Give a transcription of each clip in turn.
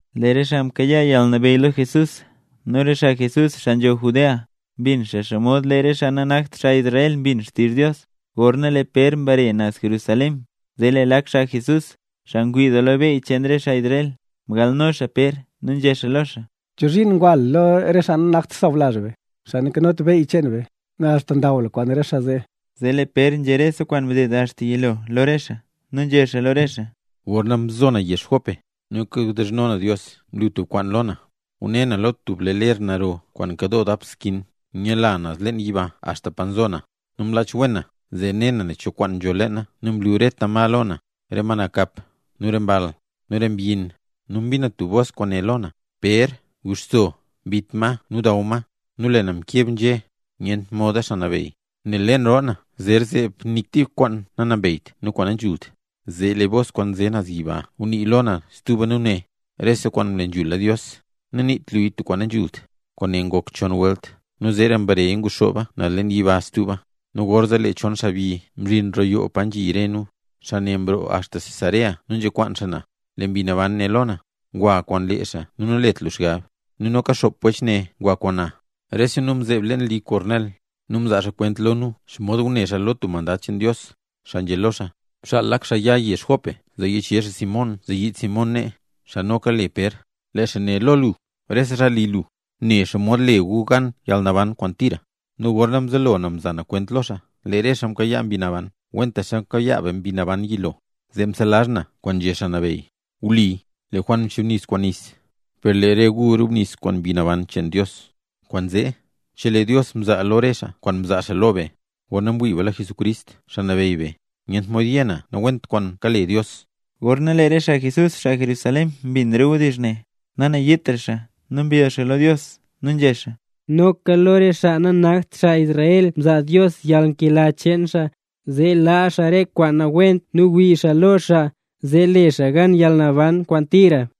Lee re xaa mkayaa yalnabeyy lo Jesús, nu re xaa Jesús, xaa nzho Judea mbin xomod lee re xaa nanakt xaa Israel mbin xaa xtizh Dios. Gorna lee Pér mbare naz Jerusalén, zee lee lak xaa Jesús, xaa ngwii doo lo beyy cheen re xaa Israel, mgalno xaa Pér, nu nzhé xaa lo xaa: —¿Chozhiin ngwa lu lo re xaa nanakt sawlazh be, xaa nanzhot beyy cheen be, nu axta ndaw lu kwaan re xaa zee? Zee lee Pér nzhé lo re xaa rese kwaan mded axta yilo lo re xaa. Nu nzhé xaa lo re xaa: —Gorna mzo na yezh Jope nu kawdizhno na Dios, mlu tub kwaan lo na. Ngune na lo tub lee ler naro kwaan nkadoo dap skin, nyaadla naz leen yiba axta pa nzo na. Nu mlach wen na zee ne na nen cho kwaan nzho leena, nu mlu re rete ma lo na, re ma nakap, nu re mball, nu re mbyin. Nu mbin na tub bos kwaan né lo na: “Pér, guxso, bit ma nu daw ma”. Nu lee na mkeb nzhé: “Nyent moda, Xaa Nabeyy, nel leen roo na zer zeeb nik tik kwaan nanambeyt nu kwaan nanzhult”. Zee lee bos kwaan nze naz yiba ngunii lo na stuba nu né: “Rese kwaan mle nzhula Dios, naniit luya tub kwaan nanzhult”. Kwaane ngok chon welt, nu zeera mbareya nguxooba naz yiba stuba. Nu gorzee lee chon xaabyi mzhin roo yoo pa nzhi re nu, xaa ne mroo axta Cesarea nu nzekwaan xaa na. Lee Mbi Naban né lo na: “Gwa kwaan lee xaa nu nalet lu xgab.” Nu noka xop wech ne ngwa kwaan na. Rese nu mzeeb leen li Kornel, nu mzaa xaa kwent lo nu xomod ngune xaa lo tub mandad cheen Dios, xaa nzhé lo xaa: “Bxaal lak xaa ya yezh Jope zee yichezh xaa Simón zee yiid Simón nee, xaa noka le Pér. Lee xaa né lo lu nu lo rese xaa li lu, nen xomod le gu gan yalnaban kwaan tira.” Nu gorna mzelo na mza na kwent lo xaa, lee re xaa mkayaa Mbi Naban kwentaxa mkayaa be Mbi Naban yilo. Zee mselazh na kwaan nzhé Xaa Nabeyy: “Wli, lee Juan mchubnis kwaan nis, per lee re gu rubnis kwaan Mbi Naban cheen Dios”. Kwaanzee, chelee Dios mzaa lo re xaa kwaan mzaa xaa lo be, gorna mwii be lo Jesucrist Xaa Nabeyy be, nyent mod yé na nawent kwaan kale Dios. Gorna lee re xaa Jesús, xaa Jerusalén mbin re wdizh ne, nanayiitra xaa, nu mbill xaa lo Dios, nu nzhé xaa: —¡Noka lo re xaa nanakt xaa Israel mzaa Dios yalnkela cheen xaa, zee laa xaa re kwaan nawent nu wii xaa lo xaa, zee le xaa gan yalnaban kwaan tira!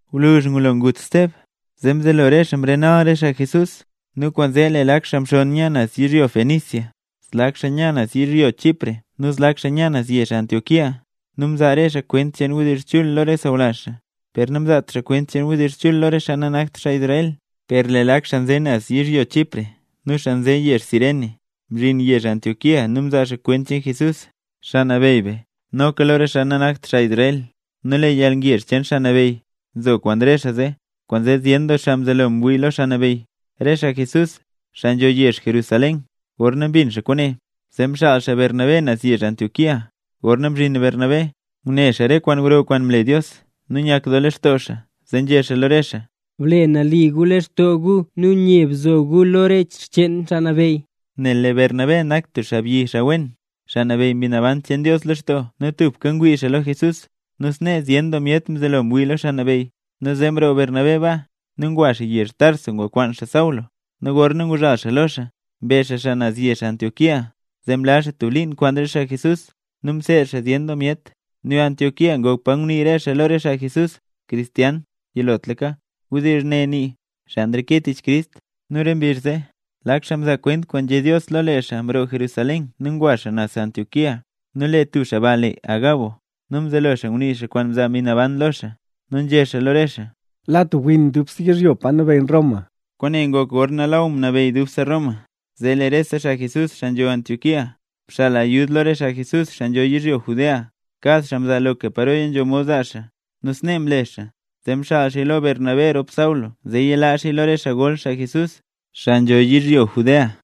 Gwluzh ngulo ngut Steb, zee mzelo re xaa mrenal re xaa Jesús, nu kwaanzee lee lak xaa mxonn nya naz yizhyo Fenicia, zlak xaa nya naz yizhyo Chipre nu zlak xaa nya naz yezh Antioquía. Nu mzaa re xaa ne kwent cheen wdizh chul lo re sawlazh xaa, per namzaat xaa kwent cheen wdizh chul lo re xaa nanakt xaa Israel. Per lee lak xaa nze naz yizhyo Chipre nu xaa nze yezh Cirene, mzhin yezh Antioquía nu mzaa xaa kwent cheen Jesús, Xaa Nabeyy be, noka lo re xaa nanakt xaa Israel. Nu lee yalngezh cheen Xaa Nabeyy nzo kwaan re xaa zee, kwaanzee zyen doo xaa mzelo ngwii lo Xaa Nabeyy. Re xaa Jesús, xaa nzho yezh Jerusalén, gorna mbin xaa kwaane, zee mxaal xaa Bernabé naz yezh Antioquía. Gorna mzhin Bernabé, ngune xaa re kwaan gro kwaan mle Dios, nu nyak doo lextoo xaa. Nu nzhé xaa lo re xaa: —Ble nali gu lextoo gu nu nye bzo gu lo re xcheen Xaa Nabeyy. Nel lee Bernabé nak tub xaabyi wen, xaa nabeyy Mbi Naban cheen Dios lextoo nu tubka ngwii xaa lo Jesús. Nu snee zyen doo myet mzelo ngwii lo Xaa Nabeyy. Nu zee mroo Bernabé baa, nu ngwa xaa yezh Tarso ngukwaan xaa Saulo, nu gorna nguzhal xaa lo xaa, mbe xaa xaa naz yezh Antioquía. Zee mlaz xaa tub liin kwaan re xaa Jesús, nu mseed xaa zyen doo myet. Nu Antioquía ngok pa ngunii re xaa lo re xaa Jesús “cristianos” yilotlaka. (Wdizh ne nii: “Xaa nreke tich Crist”.) Nu re mbizh zee, lak xaa mzaa kwent kwaan nzhé Dios lo lee xaa mroo Jerusalén nu ngwa xaa naz Antioquía. Nu lee tub xaa ba le Agabo, nu mzelo xaa ngunii kwaan mzaa Mbi Naban lo xaa, nu nzhé xaa lo re xaa: —La tub win gro doo dubse yizhyo pa nabeyy Roma. Kwaane ngok gorna lee Law mnabeyy dubse Roma. Zee lee rese xaa Jesús, xaa nzho yezh Antioquía, mxaal ayud lo re xaa Jesús, xaa nzho yizhyo Judea; kad xaa mzaa loka paroya nzho mod zaa xaa. Nu snee mle xaa; zee mxaal xaaya lo Bernabé rop Saulo zee yalaa xaaya lo re xaa gol xaa Jesús, xaa nzho yizhyo Judea.